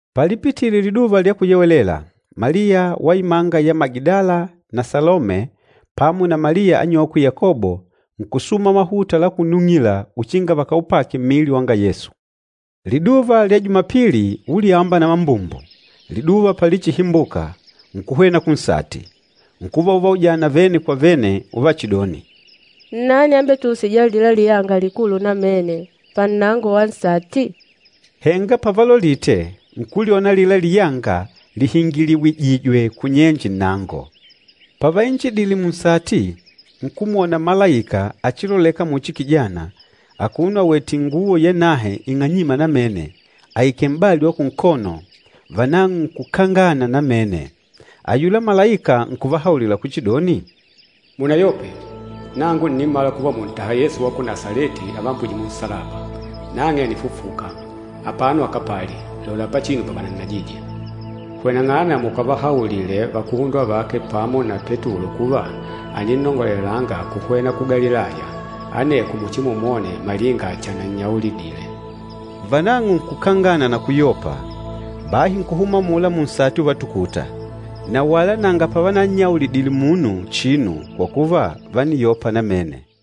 Palipitile Liduva lya Kuyewelela, Maliya wa imanga ya Magidala na Salome pamo na Maliya anyokwe Yakobo, nkusuma mahuta la kunung'ila uchinga vakaupake mmili wanga Yesu. Liduva lya Jumapili, ulyamba na mambumbu, liduva pachilihimbuka, nkuhwena kunsati. Nkuva uvaujana vene kwa vene uvachidoni, “Nnani ambetuusîja alila liyanga likulu namene pannango wa nsati?” Henga pavalolite, nkulyona alila liyanga lihingiliwijìjwè kunyenje nnango. Pavainjidile munsati, nkumwona malaika achiloleka muchi kijana, akono awètè inguwo yanahe ing'anyîma namene, aikèlè m'bali wa kunkono, vanang'o nkukangana namene. Ayula malaika nkuvahaulila kuchidoni, “Munayope. Nangu ǹnimala kuva mùntaha Yesu wa ku Nasaleti avambwîje munsalaba. Nang'e ànifufuka, apano akapali. Lola pachinu pavanannajije. Hweneng'ana mukavahaulile vakuhundwa vake pamo na Petulo kuva, àninnongolelanga kuhwena ku Galilaya. Aneko muchimumwone malinga chanannyaulidile.” Vanang'o nkukangana na kuyopa, bahi nkuhuma amula munsati uvatukuta. Na wala nanga pavanannyaulidile munu chinu, kwa kuva, vániyopa namene.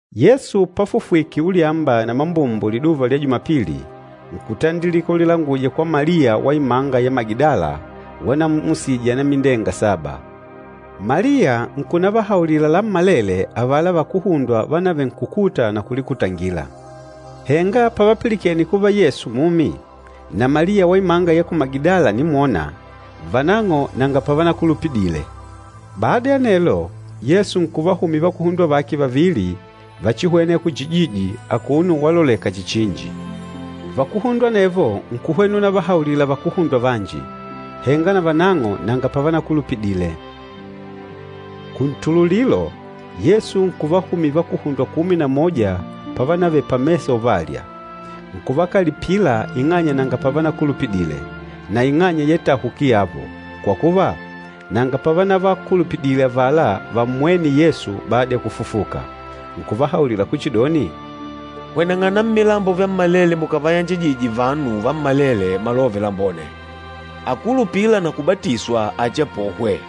Yesu pafufwike ulyamba na mambumbu liduva lya Jumapili, nkutandilika ulilanguja kwa Maliya wa imanga ya Magidala, wanammusije anamindenga saba. Maliya nkunavahaulila lammalele avala vakuhundwa vanavenkukuta na kulikutangila. Henga pavapilikene kuva Yesu mumi, na Maliya wa imanga ya ku Magidala ànimwona, vanang'o nanga pavanakulupidile. Bada ya anelo, Yesu nkuvahumila vakuhundwa vake vavili vachihwêna ya kuchijiji, akuno waloleka chihi chinji. Vakuhundwa anevo nkuhwena unavahaulila vakuhundwa vanji. Henga navanang'o nanga pavanakulupidile. Kuntululilo, Yesu nkuvahumila vakuhundwa kumi na moja pavanavele pamesa uvalya. Nkuvakalipila ing'anya nanga pavanakulupidile, na ing'anya ya itahuki yavo, kwa kuva, nanga pavanavakulupidile avala vammwêne Yesu bada ya kufufuka. Nkuvahaulila kuchidoni, “Hweneng'ana mmilambo vyammalele mukàvayanjajije vanu vammalele Malove Lambone. Akúlupila na kubatiswa achiapohwe,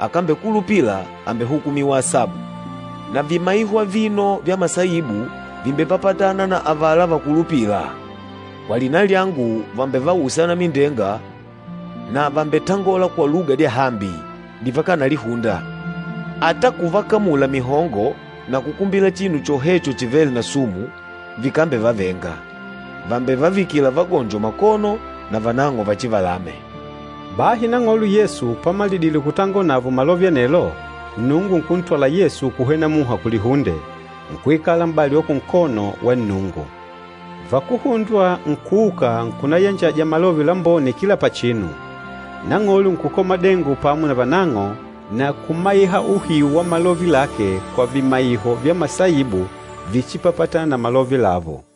akambekulupila àmbehukumiwa asabu. Na vimaiho avino vya masaibu vìmbepapatana na avala vakulupîla, kwa lina lyangu vàmbevausa anamindenga na vàmbetangola kwa luga dyahambi, divakanalihunda. Ata kuvakamula mihongo na kukumbila chinu chohecho chivêle na sumu, vikambevavenga. Vàmbevavikila vagonjo makono, na vanang'o vachivalame.” Bahi Nang'olo Yesu pamalidile kutangola navo malove anelo, Nnungu nkuntwala Yesu kuhwena muha kulihunde kwa Nnungu, nkuikala m'bali wa kunkono wa Nnungu. Vakuhundwa nkuuka nkunayanjaja Malove Lambone kila pachinu. Nang'olo nkukola madengo pamo navanang'o, na kumaiha uhiu wa malove lake kwa vimaiho vya masaibu víchipapatànà na malove lavo.